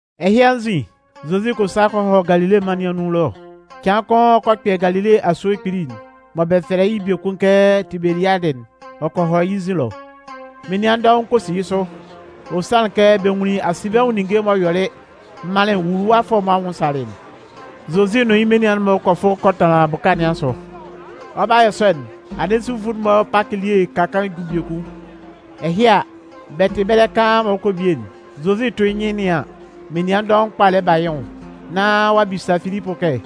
Ɛhɩ anzin, Zozi kɔ sa kɔ hɔ Galile mân nɩn anun ɛlɔ. Cɩan kʋn ɔ kɔ kpɛ Galile asue kpili'n mɔ bɛ fɛlɛ yɩ́ biekun kɛ Tibeliadɩ'n, ɔ kɔ hɔ yɩ́ nzin ɛlɔ. Menian dɔʋn kpa kɔ si yɩ́ sʋ, ɔ sanlɩn kɛ bɛ nwunlin asinbɛnwʋn ninnge m'ɔ yɔlɩ manlɩn nwuluwafʋɛ'n-mɔ anwʋn salɩ'n. Zozi nʋn yɩ́ menian'n-mɔ kɔ fʋ kɔ tanlan bʋka kʋn asʋ. Ɔ 'ba yɔ sɔ'n, anɩn Zufʋ'n-mɔ Pakɩ elie'n ka kaan ju biekun. Ɛhɩ a, bɛ tɩ ɛbɛlɛ kaan mɔ ɔ 'kɔ bie'n, Zozi 'tʋ yɩ́ nyɩn nɩan an, menian dɔʋn kpa lɛ ba yɩ́ nwʋn, nán ɔ'a bisa Filipʋ kɛ: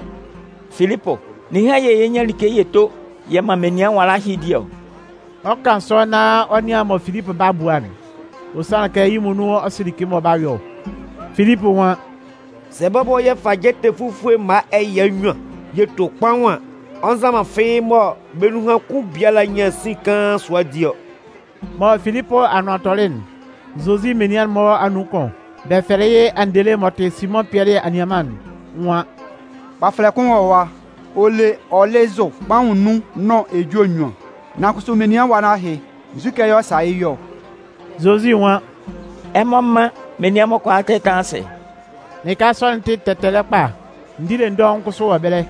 “Filipʋ, ninhan yɛ̂ yɛ 'nyan like yɛ to yɛ man menian nwala ɛhɩ di ɔ?” Ɔ 'kan sɔ nán ɔ nɩan mɔ Filipʋ 'ba bua'n. Ɔ sanlɩn kɛ yɩ́ muonun ɔ sɩ like mɔ ɔ 'ba yɔ ɔ. Filipʋ nwan: “Sɛ bɔbɔ yɛ fa jɛtɛ fufue mma ɛya nnyuan yɛ to kpaʋn an, ɔ nza man fɩ́ɩ́ mɔ bɛ́ nun kʋn biala nyan sin kaan sʋa di ɔ.” M'ɔ Filipʋ anʋan tɔlɩ'n, Zozi menian'n-mɔ anun kʋn, bɛ fɛlɛ yɩ́ Andele m'ɔ tɩ Simʋn Pɩɛlɩ anianman'n nwan: “Kpafɛlɛ kaan kʋn wɔ ɛwa, ɔ le ɔlɩzʋ kpaʋn nnun nʋn ejue nnyuan. Nan kʋsʋ menian nwala ɛhɩ, nzukɛ yɛ̂ ɔ 'sa yɩ́ yɔ ɔ?” Zozi nwan: “Ɛmɔ mán menian'n-mɔ kʋalaa tɛ́tanlan asɩ.” Lɩka sɔ'n tɩ tɛtɛlɛ kpa, ndile dɔʋn kʋsʋ wɔ ɛbɛlɛ.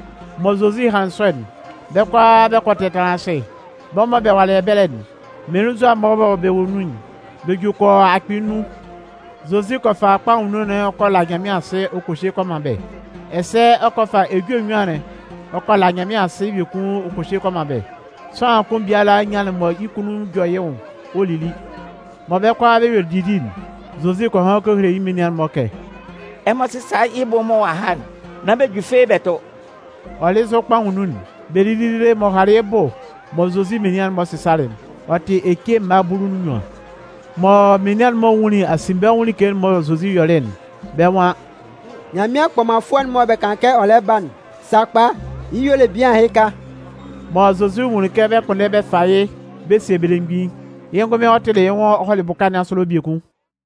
Mɔ Zozi hanlɩn sɔ'n, bɛ́ kʋalaa bɛ kɔ tɛtanlan asɩ. Bɛ́ mɔ bɛ walɩ ɛbɛlɛ'n, mmelenzua mɔ bɛ wɔ bɛ́ nun'n, bɛ ju kɔ yɔ akpɩɩ nnun. Zozi kɔ fa kpaʋn nnun'n ɔ kɔ la Nyanmɩan asɩ ɔ kɔ hye kɔ man bɛ́. Ɛsɛ ɔ kɔ fa ejue nnyuan'n ɔ kɔ la Nyanmɩan asɩ biekun ɔ kɔ hye kɔ man bɛ́. Sʋanlan kʋn biala nyanlɩn mɔ yɩ́ kunnun jɔ yɩ́ nwʋn ɔ lili. Mɔ bɛ́ kʋalaa bɛ yuelɩ didi'n, Zozi kɔ han kɔ hele yɩ́ menian'n-mɔ kɛ: “Ɛmɔ sɩ́sa yɩ́ bʋ'n mɔ ɔ'a ha'n, nán bɛ ju fɩ́ɩ́ bɛ tʋ.” Ɔlɩzʋ kpaʋn nnun'n, bɛ lili dede m'ɔ halɩ yɩ́ bʋ mɔ Zozi menian'n-mɔ sɩsalɩ'n, ɔ tɩ ece mma bulu nʋn nnyuan. Mɔ menian'n-mɔ nwunlin asinbɛnwʋn like'n mɔ Zozi yɔlɩ'n, bɛ́ nwan: “Nyanmɩan kpɔmanfʋɛ'n mɔ bɛ kan kɛ ɔ lɛ ba'n, sakpa, yɩ́ y'ɔ le bian ɛhɩka.” Mɔ Zozi nwunlin kɛ bɛ 'kpʋnndɛ bɛ fa yɩ́ bɛ sie bɛ́ belemgbin'n, yɩ́ ngʋnmɩn ɔ tɩlɩ yɩ́ nwʋn ɔ hɔlɩ bʋka nɩn asʋ ɛlɔ biekun.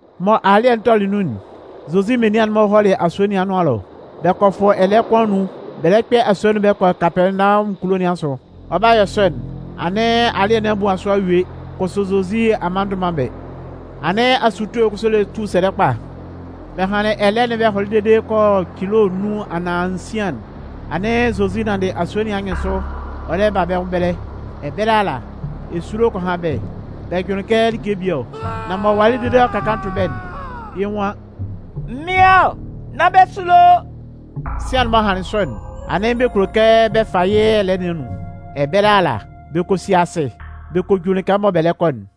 Mɔ alɩ́ɛ'n tɔlɩ nun'n, Zozi menian'n-mɔ hɔlɩ asue nɩn anʋan ɛlɔ. Bɛ kɔ fʋ ɛlɛɛ kʋn anun bɛ lɛ kpɛ asue'n bɛ kɔ Kapɛɛnawɔmʋn kulo nɩn asʋ. Ɔ 'ba yɔ sɔ'n, anɩn alɩ́ɛ nɩn a muan sʋ a yue, kʋsʋ Zozi a mma ndʋ man bɛ́. Anɩn asutue kʋsʋ lɛ tu sɛlɛ kpa. Bɛ hanlɩn ɛlɛɛ'n bɛ hɔlɩ dede kɔ yɔ cilo nnun anaan nsian'n, anɩn Zozi nanndɩ asue nɩn anyɩnsʋ ɔ lɛ ba bɛ́ nwʋn ɛbɛlɛ. Ɛbɛlɛ ala, esulo kɔ han bɛ́, bɛ jʋnlɩn kɛ like bie ɔ. Nan m'ɔ walɩ dede m'ɔ ka kaan tʋ bɛ́'n, yɩ́ nwan: “Mɩ́n ɔ, nán bɛ sulo.” Sian'n m'ɔ hanlɩn sɔ'n, anɩn bɛ kulo kɛ bɛ fa yɩ́ ɛlɛɛ nɩn anun. Ɛbɛlɛ ala, bɛ kɔ si asɩ, bɛ kɔ ju lɩka mɔ bɛ lɛ kɔ'n.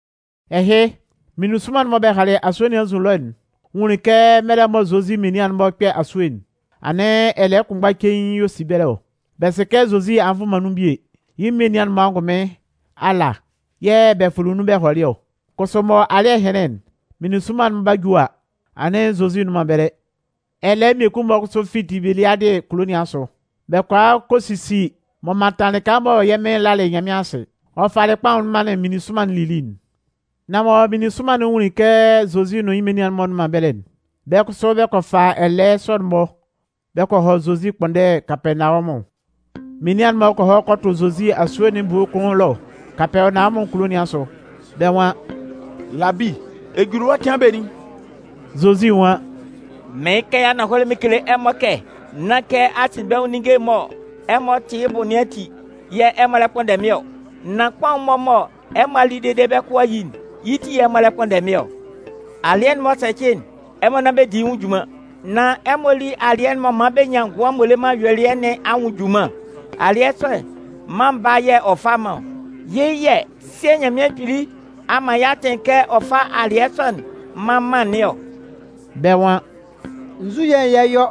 Ɛhɩ, meninsʋnman'n mɔ bɛ halɩ asue nɩn anzin ɛlɔ'n nwunlin kɛ mɛlɛ mɔ Zozi menian'n-mɔ 'kpɛ asue'n, anɩn ɛlɛɛ kʋnmgba cein yɛ̂ ɔ si ɛbɛlɛ ɔ. Bɛ sɩ kɛ Zozi a nvʋ man nun bie, yɩ́ menian'n-mɔ angʋnmɩn ala yɛ̂ bɛ fʋlɩ nun bɛ hɔlɩ ɔ. Kʋsʋ mɔ alɩ́ɛ hɩnlɩn'n, meninsʋnman'n 'ba ju a, anɩn Zozi nnʋn man ɛbɛlɛ. Ɛlɛɛ mmie-mɔ kʋsʋ fi Tibeliadɩ kulo nɩn asʋ, bɛ kɔ a kɔ sisi m'ɔ mantan lɩka mɔ yɛ́ Mɩn lalɩ Nyanmɩan asɩ, ɔ falɩ kpaʋn'n manlɩn meninsʋnman'n lili'n. Nan mɔ meninsʋnman'n nwunlin kɛ Zozi nʋn yɩ́ menian'n-mɔ nnʋn man ɛbɛlɛ'n, bɛ́ kʋsʋ bɛ kɔ fa ɛlɛɛ sɔ'n-mɔ bɛ kɔ hɔ Zozi ɛkpʋnndɛ Kapɛɛnawɔmʋn. Menian'n-mɔ kɔ hɔ kɔ tʋ Zozi asue nɩn ebue kʋn ɛlɔ Kapɛɛnawɔmʋn kulo nɩn asʋ, bɛ́ nwan: “Labi, ɛ juli ɛwa cɩan benin?” Zozi nwan: “Mɩɩn kan yɩ́ ananhɔlɛ mɩn kele ɛmɔ kɛ nán kɛ asinbɛnwʋn ninnge'n mɔ ɛmɔ tɩ yɩ́ bʋ nɩn ati yɛ̂ ɛmɔ lɛ kpʋnndɛ mɩ́n ɔ. Nan kpaʋn'n mɔ ɛmɔ a li dede bɛ́ kʋ a yi'n, yɩ́ ti yɛ̂ ɛmɔ lɛ kpʋnndɛ mɩ́n ɔ. Alɩɛ'n m'ɔ sɛcɩ'n, ɛmɔ nán bɛ di yɩ́ nwʋn junman. Nan ɛmɔ lí alɩɛ'n m'ɔ man bɛ nyan ngʋan m'ɔ le man ayuelɩɛ nɩn anwʋn junman. Alɩɛ sɔ'n, Mân Baa'n yɛ̂ ɔ fa man ɔ. Yɩ́ yɛ̂ Sɩɛ Nyanmɩan Kpili a man yɩ́ atɩn kɛ ɔ fá alɩɛ sɔ'n mán mân nɩn ɔ.” Bɛ́ nwan: “Nzu yɛ̂ yɛ 'yɔ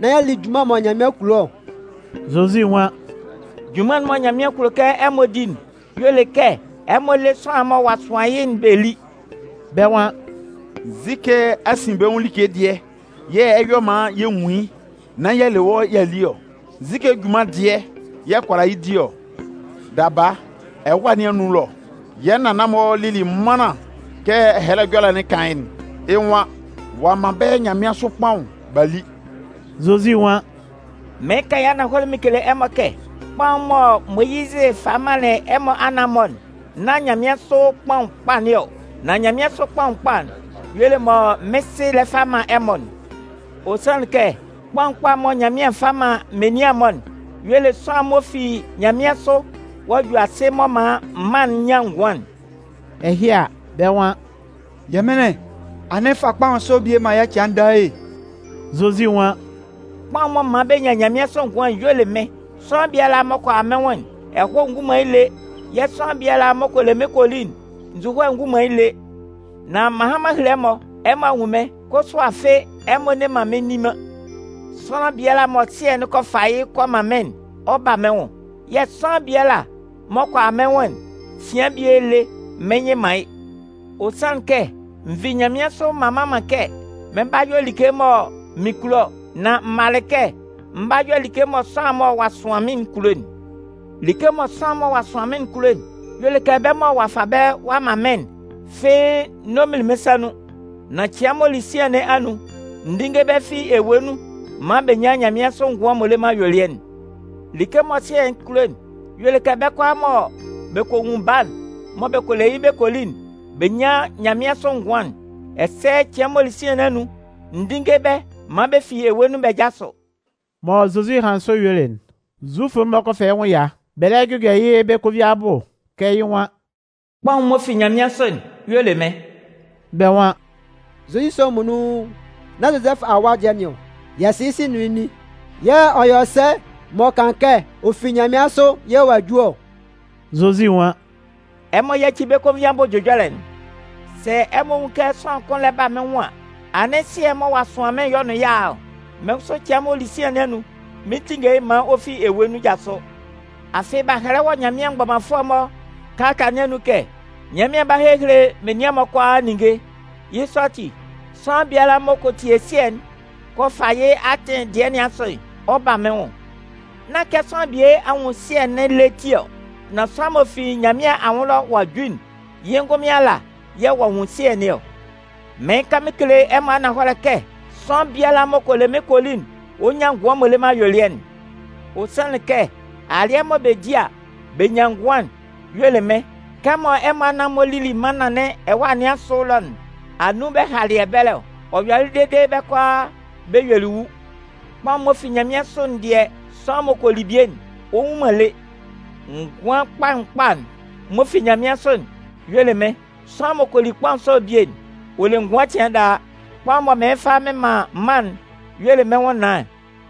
nán y'a li junman mɔ Nyanmɩan kulo ɔ?” Zozi nwan: “Junman'n mɔ Nyanmɩan kulo kɛ ɛmɔ di'n y'ɔ le kɛ ɛmɔ lé sʋanlan'n mɔ ɔ'a sʋan yɩ́'n bɛ lí.” Bɛ́ nwan: “Nzukɛ asinbɛnwʋn like dɩɛ yɛ̂ ɛ 'yɔ maan yɛ nwun yɩ́ nán y'a le wɔ́ y'a li ɔ? Nzu junman dɩɛ yɛ̂ ɛ kʋala yɩ́ di ɔ? Daba, ɛwâ nɩn anun ɛlɔ, yɛ́ nannan-mɔ lili mannan kɛ Ɛhɛlɛ Ɛjɔlɛ'n kan yɩ́'n. Yɩ́ nwan: Ɔ'a man bɛ́ nyanmɩansʋ kpaʋn b'a li.” Zozi nwan: “Mɩɩn kan yɩ́ ananhɔlɛ mɩn kele ɛmɔ kɛ, kpaʋn'n mɔ Moyizɩ falɩ manlɩn ɛmɔ anan-mɔ'n, nán nyanmɩansʋ kpaʋn kpa nɩn ɔ. Nan nyanmɩansʋ kpaʋn kpa'n y'ɔ le mɔ mɩ́n Sɩ lɛ fa man ɛmɔ'n. Ɔ sanlɩn kɛ, kpaʋn kpa'n mɔ Nyanmɩan fa man menian'n-mɔ'n y'ɔ le sʋanlan'n m'ɔ fi nyanmɩansʋ ɔ'a ju asɩ m'ɔ man mân'n nyan ngʋan'n.” Ɛhɩ a, bɛ́ nwan: “Yɛmɩnlɩn, anɩn fa kpaʋn sɔ'n bie man yɛ́ cɩan daa e.” Zozi nwan: “Kpaʋn'n m'ɔ man bɛ nyan nyanmɩansʋ ngʋan'n y'ɔ le mɩ́n. Sʋanlan biala m'ɔ kɔ a mɩ́n nwʋn'n, ɛhɔɛ ngun man yɩ́ lé. Yɛ̂ sʋanlan biala m'ɔ kɔ le mɩ́n kɔ li'n, nzuhoe ngun man yɩ́ lé. Nan m'an han m'an hele ɛmɔ, ɛmɔ a nwun mɩ́n, kʋsʋ afɩ ɛmɔ nne man mɩ́n nni man. Sʋanlan biala mɔ Sɩɛ'n kɔ fa yɩ́ kɔ man mɩ́n'n, ɔ 'ba mɩ́n nwʋn. Yɛ̂ sʋanlan biala m'ɔ kɔ a mɩ́n nwʋn'n, cɩan bie lé, mɩn nyɩ man yɩ́. Ɔ sanlɩn kɛ n vi nyanmɩansʋ m'an mma man kɛ mɩn 'ba yɔ like mɔ mɩn kulo ɔ. Nan m malɩ kɛ mɩn 'ba yɔ like mɔ sʋanlan'n mɔ ɔ'a sʋan mɩ́n'n kulo'n. Like mɔ sʋanlan'n mɔ ɔ'a sʋan mɩ́n'n kulo'n y'ɔ le kɛ bɛ́ mɔ ɔ'a fa bɛ́ ɔ'a man mɩ́n'n fɩ́ɩ́ n'ɔ minlin mɩ́n sa nun. Nan cɩan m'ɔ li sian nɩn anun, n dínnge bɛ́ fi ewue nun maan bɛ nyan nyanmɩansʋ ngʋan m'ɔ le man ayuelɩɛ'n. Like mɔ Sɩɛ'n kulo'n y'ɔ le kɛ bɛ́ kʋalaa mɔ bɛ kɔ nwun Baa'n mɔ bɛ kɔ le yɩ́ bɛ kɔ li'n, bɛ nyán nyanmɩansʋ ngʋan'n. Ɛsɛ cɩan m'ɔ li sian nɩn anun, n dínnge bɛ́ maan bɛ fi ewue nun bɛ jásʋ.” Mɔ Zozi hanlɩn sɔ yuelɩ'n, Zufʋ'n-mɔ kɔ fɛ yɩ́ nwʋn ɛya, bɛ lɛ jʋjɔ yɩ́ bɛ́ konvin abʋ kɛ yɩ́ nwan: “Kpaʋn'n m'ɔ fi nyanmɩansʋ'n y'ɔ le mɩ́n”. Bɛ́ nwan: “Zozi sɔ'n muonun, nán Zozɛfʋ awa dɩɛ nɩn ɔ? Yɛ sɩ yɩ́ sɩ nʋn yɩ́ nin. Yɛ̂ ɔ yɔ sɛ m'ɔ kan kɛ ɔ fi nyanmɩansʋ yɛ̂ ɔ'a ju ɔ?” Zozi nwan: “Ɛmɔ yáci bɛ́ konvin abʋ ɛjʋjɔlɛ'n. Sɛ ɛmɔ nwun kɛ sʋanlan kʋn lɛ ba mɩ́n nwʋn an, anɩn Sɩɛ'n mɔ ɔ'a sʋan mɩ́n'n y'ɔ nʋn yɩ́ a a ɔ. Mɩ́n kʋsʋ cɩan m'ɔ li sian nɩn anun, mɩn 'tinnge yɩ́ maan ɔ fi ewue nun jasʋ. Afɩ b'a hɛlɛ wɔ Nyanmɩan mgbɔmanfʋɛ'n-mɔ kalata nɩn anun kɛ: Nyanmɩan 'ba hehele menian'n-mɔ kʋalaa ninnge. Yɩ́ sɔ ati, sʋanlan biala m'ɔ kɔ tie Sɩɛ'n kɔ fa yɩ́ atɩn dɩɛ nɩn asʋ'n, ɔ 'ba mɩ́n nwʋn. Nán kɛ sʋanlan bie a nwun Sɩɛ'n lé ti ɔ, nan sʋanlan'n m'ɔ fi Nyanmɩan anwʋn ɛlɔ ɔ'a ju'n, yɩ́ ngʋnmɩn ala yɛ̂ ɔ'a nwun Sɩɛ nɩn ɔ. Mɩɩn kan yɩ́ ananhɔlɛ mɩn kele ɛmɔ kɛ sʋanlan biala m'ɔ kɔ le mɩ́n kɔ li'n, ɔ 'nyan ngʋan m'ɔ le man ayuelɩɛ'n. Ɔ sanlɩn kɛ alɩɛ mɔ bɛ di a, bɛ nyan ngʋan'n y'ɔ le mɩ́n. Kɛ ɛmɔ anan-mɔ lili mannan nɩn ɛwâ nɩn asʋ ɛlɔ'n, anun bɛ halɩ ɛbɛlɛ ɔ? Ɔ yɔlɩ dede bɛ́ kʋalaa bɛ yuelɩ wu. Nan kpaʋn'n m'ɔ fi nyanmɩansʋ'n dɩɛ, sʋanlan m'ɔ kɔ li bie'n, ɔ nwu man lé. Ngʋan kpaʋn kpa'n m'ɔ fi nyanmɩansʋ'n y'ɔ le mɩ́n. Sʋanlan m'ɔ kɔ li kpaʋn sɔ'n bie'n, ɔ le ngʋan cɩan daa. Kpaʋn'n mɔ mɩn 'fa mɩn man'n y'ɔ le mɩ́n nwʋnnaan'n.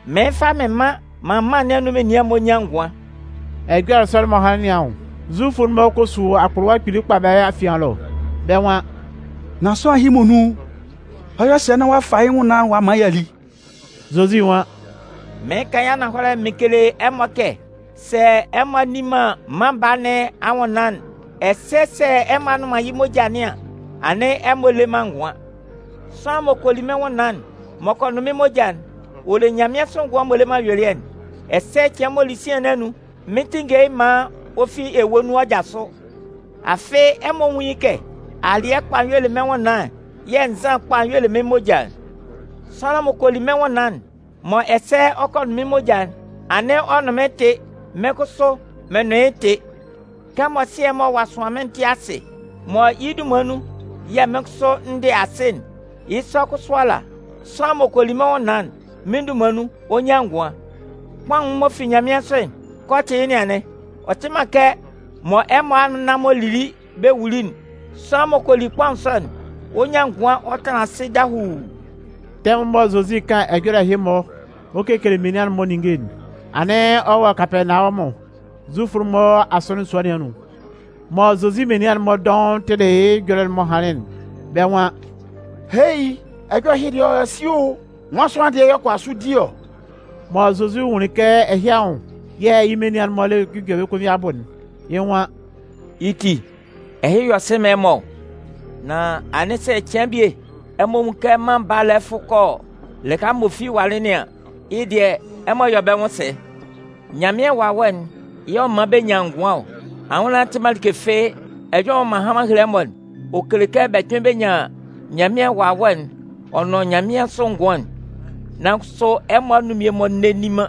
Mɩn 'fa mɩn man maan mân nɩn anun menian'n-mɔ nyan ngʋan.” Ɛjɔlɛ sɔ'n m'ɔ hanlɩn nɩn anwʋn, Zufʋ'n-mɔ kɔ su akpʋlʋwa kpili kpa bɛ́ afian ɛlɔ, bɛ́ nwan: “Nan sʋanlan ɛhɩ muonun, ɔ 'yɔ sɛ nán ɔ'a fa yɩ́ nwʋnnaan'n ɔ'a man y'a li?” Zozi nwan: “Mɩɩn kan yɩ́ ananhɔlɛ mɩn kele ɛmɔ kɛ sɛ ɛmɔ a nni man Mân Baa nɩn anwʋnnaan'n, ɛsɛ sɛ ɛmɔ a nnʋn man yɩ́ moja nɩn an, anɩn ɛmɔ le man ngʋan. Sʋanlan m'ɔ kɔ li mɩ́n nwʋnnaan'n, m'ɔ kɔ nʋn mɩ́n moja'n, ɔ le nyanmɩansʋ ngʋan m'ɔ le man ayuelɩɛ'n, ɛsɛ cɩan m'ɔ li sian nɩn anun, mɩn 'tinnge yɩ́ maan ɔ fi ewue nun ɔ jasʋ. Afɩ ɛmɔ nwún yɩ́ kɛ, alɩɛ kpa'n y'ɔ le mɩ́n nwʋnnaan'n yɛ̂ nzan kpa'n y'ɔ le mɩ́n moja'n. Sʋanlan m'ɔ kɔ li mɩ́n nwʋnnaan'n, mɔ ɛsɛ ɔ kɔ nʋn mɩ́n moja'n, anɩn ɔ nʋn mɩ́n tɩ, mɩ́n kʋsʋ, mɩn nʋn yɩ́ tɩ. Kɛmɔ Sɩɛ'n mɔ ɔ'a sʋan mɩ́n'n tɩ asɩ mɔ yɩ́ dunman nun yɛ̂ mɩ́n kʋsʋ n dɩ asɩ'n, yɩ́ sɔ kʋsʋ ala, sʋanlan m'ɔ kɔ li mɩ́n nwʋnnaan'n, mɩ́n dunman nun, ɔ 'nyan ngʋan. Kpaʋn'n m'ɔ fi nyanmɩansʋ'n, kɛ ɔ tɩ yɩ́ nɩn anɩn. Ɔ tɩ man kɛ mɔ ɛmɔ anan-mɔ lili bɛ wuli'n. Sʋanlan m'ɔ kɔ li kpaʋn sɔ'n, ɔ 'nyan ngʋan ɔ tanlan asɩ dahuu.” Tɛmʋn mɔ Zozi 'kan ɛjɔlɛ ɛhɩ-mɔ ɔ kekele menian'n-mɔ ninnge'n, anɩn ɔ wɔ Kapɛɛnawɔmʋn, Zufʋ'n-mɔ asɔnɩn sua nɩn anun. Mɔ Zozi menian'n-mɔ dɔʋn tɩlɩ yɩ́ ɛjɔlɛ'n m'ɔ hanlɩn'n, bɛ́ nwan: “Hei! Ɛjɔlɛ ɛhɩ dɩɛ ɔ yɔ sɩ o! Nwan sʋanlan dɩɛ yɛ̂ ɔ kʋala sʋ di ɔ?” Mɔ Zozi nwunlin kɛ ɛhɩ anwʋn yɛ̂ yɩ́ menian'n-mɔ lɛ jʋjɔ bɛ́ konvin abʋ'n, yɩ́ nwan: “Yɩ́ ti, ɛhɩ yɔ sɩ man ɛmɔ ɔ? Nan anɩn sɛ cɩan bie ɛmɔ nwun kɛ Mân Baa'n lɛ fʋ kɔ lɩka m'ɔ fi walɩ nɩn an, yɩ́ dɩɛ, ɛmɔ 'yɔ bɛ́ nwʋn sɛ? Nyanmɩan Wawɛ'n yɛ̂ ɔ man bɛ nyan ngʋan ɔ. Anwʋnnaan'n tɩ man like fɩ́ɩ́. Ɛjɔlɛ'n mɔ m'an han m'an hele ɛmɔ'n, ɔ kele kɛ bɛ kpɩn bɛ nyan Nyanmɩan Wawɛ'n ɔ nʋn nyanmɩansʋ ngʋan'n. Nan kʋsʋ ɛmɔ anun mmie-mɔ nne nni man.”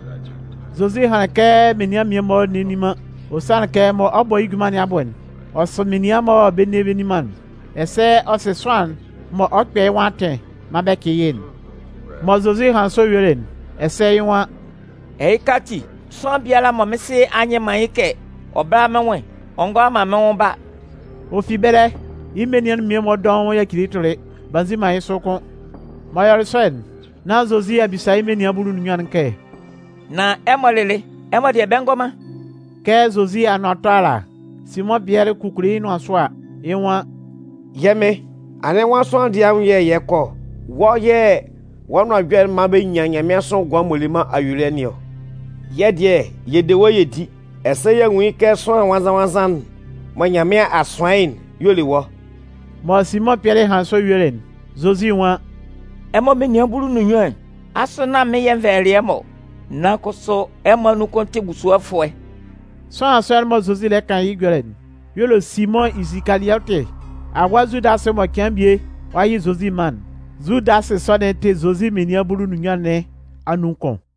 Zozi hanlɩn kɛ menian'n mmie-mɔ nne nni man, ɔ sanlɩn kɛ mɔ ɔ 'bɔ yɩ́ junman nɩn abʋ'n, ɔ sɩ menian mɔ bɛ nne bɛ nni man'n, ɛsɛ ɔ sɩ sʋanlan'n mɔ ɔ 'kpɛ yɩ́ nwʋn atɩn maan bɛ cɩ yɩ́'n. Mɔ Zozi hanlɩn sɔ yuelɩ'n, ɛsɛ yɩ́ nwan: “Ɛhɩka ati, sʋanlan biala mɔ mɩ́n Sɩ a nyɩ man yɩ́ kɛ ɔ bála mɩ́n nwʋn'n, ɔ ngʋala man mɩ́n nwʋn ba.” Ɔ fi ɛbɛlɛ, yɩ́ menian'n mmie-mɔ dɔʋn yacili yɩ́ tʋlɩ, b'a nzi man yɩ́ sʋ kʋ́n. M'ɔ yɔlɩ sɔ'n, nán Zozi a bisa yɩ́ menian bulu nʋn nnyuan'n kɛ: “Nan ɛmɔ lɩlɩ, ɛmɔ dɩɛ bɛ ngɔ man?” Kɛ Zozi anʋan 'tɔ ala, Simʋn Pɩɛlɩ kukuli yɩ́ nʋan sʋ a, yɩ́ nwan: “Yɛ́ Mɩn, anɩn nwan sʋanlan dɩɛ anwʋn yɛ̂ yɛ 'kɔ ɔ? Wɔ́ yɛ̂ wɔ́ nʋan ɛjɔlɛ'n man bɛ nyan nyanmɩansʋ ngʋan m'ɔ le man ayuelɩɛ nɩn ɔ. Yɛ́ dɩɛ yɛ de wɔ́ yɛ di, ɛsɛ y'a nwun kɛ Sʋanlan Nwannzan-nwannzan'n mɔ Nyanmɩan a sʋan yɩ́'n y'ɔ le wɔ́.” Mɔ Simʋn Pɩɛlɩ hanlɩn sɔ yuelɩ'n, Zozi nwan: “Ɛmɔ menian bulu nʋn nnyuan'n, asʋ nán mɩ́n yɛ̂ n vɛlɛlɩ ɛmɔ ɔ? Nan kʋsʋ ɛmɔ anun kʋn tɩ busuɔfʋɛ.” Sʋanlan sɔ'n mɔ Zozi lɛ kan yɩ́ ɛjɔlɛ'n y'ɔ le Simʋn Isikaliɔtɩ awa Zudasɩ mɔ cɩan bie ɔ 'yɩ Zozi man'n. Zudasɩ sɔ'n tɩ Zozi menian bulu nʋn nnyuan nɩn anun kʋn.